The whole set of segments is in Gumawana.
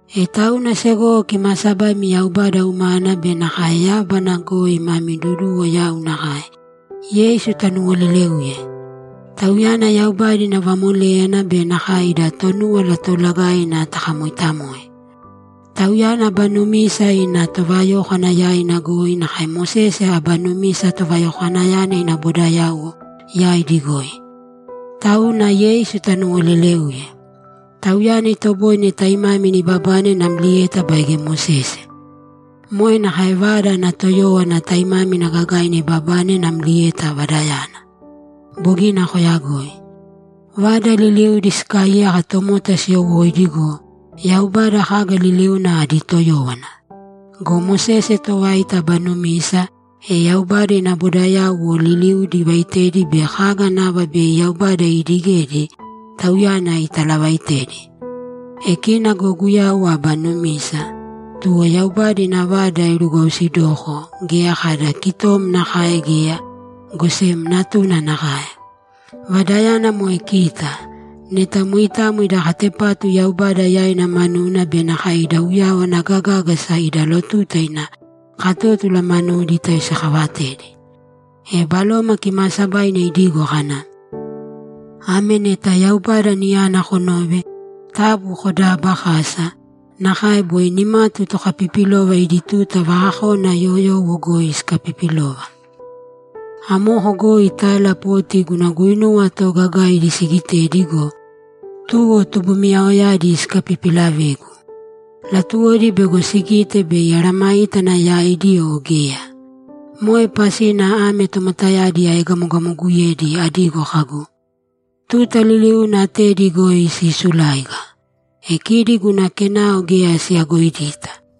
E tauna segowo kimaasabaimi Yaubada umana be nakae yábana goi mami duduwo yau nakae, Yeisu tanuwolelēuye. Tauyana Yaubada ina vamoléyana be nakae ida Tonúwala Toolagaina takamooitamoe. Tauyana aba numisa ina tovayókwana yaina goi nakae Mosese aba numisa tovayokwanayana ina bodayauwo yaidi goi. Tauna Yeisu tanuwolelēuye. Tauyana itoboine taimámina ibabane namlieta baige Mosese. Moe nakae vada ana toyówana taimámina gagaina ibabane namlieta vadayana. Bogina koyagoi. Vada liliudi sikaaiyaka tomota siyowóidi go, Yaubada kaga liliuna adi toyówana. Go Mosese tovaita aba numisa, e Yaubada ina bodayauwo liliudi ivaitedi be kaga nava bei Yaubada iidigedi tauyana italavaitedi. E kina go Guyau aba numisa, tuwo Yaubada ina vada irugwausidoko geya kada kitom nakae geya, go sem Natuna nakae. Vadayana moe kita, neta moitamo ida katepatu Yaubada yaina manuna be nakae ida uyawana gagágasa ida lotuta ina katótula manudi tayoisikaavatedi. E Baloma Kimaasabaina idigo kana, ‘Ame neta Yaubada niyana konove, taabu kodaabakāsa nakae boi nimatu tokapipilova idi tuta vakakona yoyowo goi sikapipilova. Amoko goi tala poti guna guinuwa toogagaidi siigitedi go, tuwo tubumiyaoyadi sikapipilavegu. Latuwodi bego sigite bei amesayágana yaidi o geya. Moe pasina ame tomotayadi aegamogamoguyedi, adigo kagu, “Tuta liliuna atedi goi siisuláiga. E kidi guna kenao geya siyagoidita.”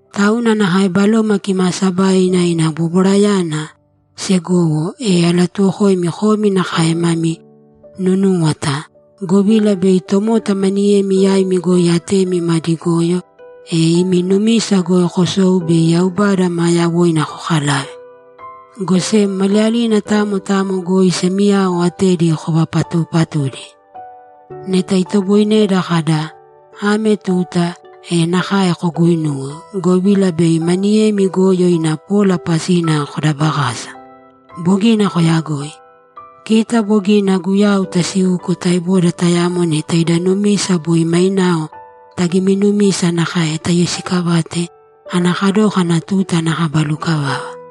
Tauna nakae Baloma Kimaasabaina ina bobwarayana, segowo, e alatuwokoimi komi nakae mami nunūwata, govila bei tomota maniyemi yaimi goi atemi madi goyo, e imi numisa goi kosou bei Yaubada maa yawoina kokalave. Go sem maliyalina tamo tamo goi semiyao atedi kovapatuupatūdi. Neta itoboineda kada, ‘Ame tuta’, e nakae koguuinūwe, govila bei maniyemi goyo ina pola pasina kodabakasa. Bogina koyagoi. Kita bogina Guyau tasiuko taeboda tayamo neta ida numisa boi mainao tagiminumisa nakae tayoisikavate ana kadókana tuta ana kaba lukavava.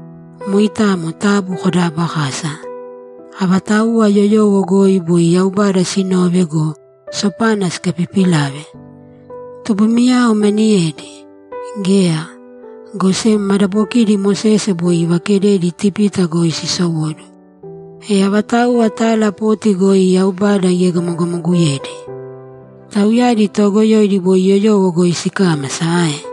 Moitamo taabu kodaabakāsa. Avatauwa yoyowo goi boi Yaubada sinove go, sopana sikapipilave? Tubumiyao maniyedi? Geya, go sem madabokiidi Mosese boi ivakededi Itipita goi sisowóduwo. E avatauwa tala poti goi Yaubada iegamogamoguyedi? Tauyadi toogoyoidi boi yoyowo goi sikámasa ae?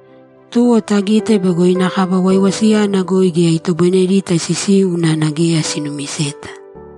Tuwo tagite bego ina kaba waiwasiyana goi geya itoboinedita sisiu unana geya sinumiseta.